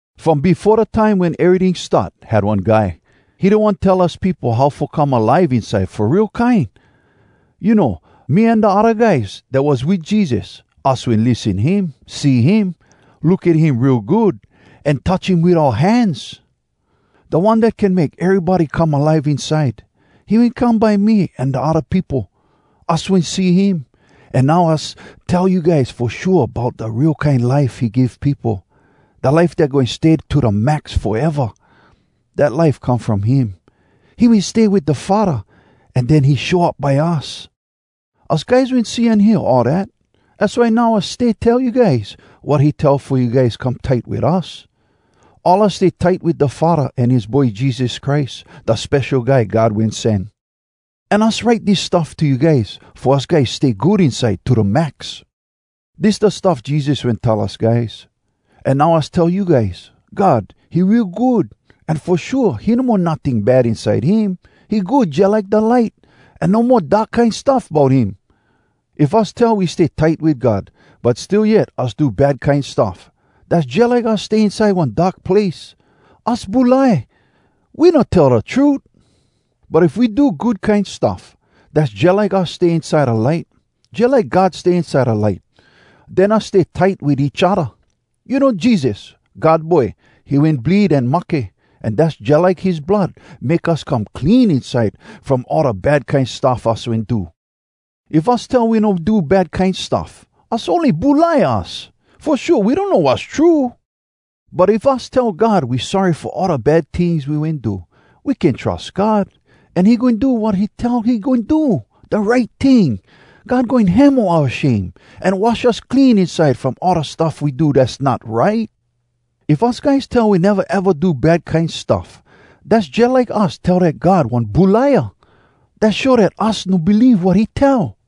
From befo da time wen eryting start, had one Guy. He da One tell us peopo how fo come alive inside fo real kine! You know, me an da odda guys dat was wit Jesus, us wen lissen him, see him, look at him real good, an touch him wit oua hands! Da One dat can make erybody come alive inside, he wen come by me an da odda peopo. Us wen see him, an now us tell you guys fo shua bout da real kine life he give peopo, da life dat goin stay to da max foeva! Dat life come from him. He wen stay wit da Faddah, an den he show up by us. Us guys wen see an hear all dat. Az why now us stay tell you guys wat he tell fo you guys come tight wit us. All us stay tight wit da Faddah an his Boy Jesus Christ, da Spesho Guy God Wen Sen. An us write dis stuff to you guys, fo us guys stay good inside to da max. Dis da stuff Jesus wen tell us guys, an now us tell you guys: God, he real good, an fo shua he no mo notting bad inside him. He good jalike da light, an no mo dark kine stuff bout him. If us tell we stay tight wit God, but still yet us do bad kine stuff, dass jalike us stay inside one dark place. Us bulai, we no tell da trut. But if we do good kine stuff, dass jalike us stay inside da light, jalike God stay inside da light. Den us stay tight wit each odda. You know, Jesus, God Boy, he wen bleed an mahke, an dass jalike his blood make us come clean inside from all da bad kine stuff us wen do. If us tell we no do bad kine stuff, us ony bulai us! Fo shua we donno wass true! But if us tell God we sorry fo all da bad tings we wen do, we can trus God. An he goin do wat he tell he goin do: da right ting. God goin hemo oua shame, an wash us clean inside from all da stuff we do dass not right. If us guys tell we neva eva do bad kine stuff, dass jalike us tell dat God one bulaia. Dat show dat us no believe wat he tell.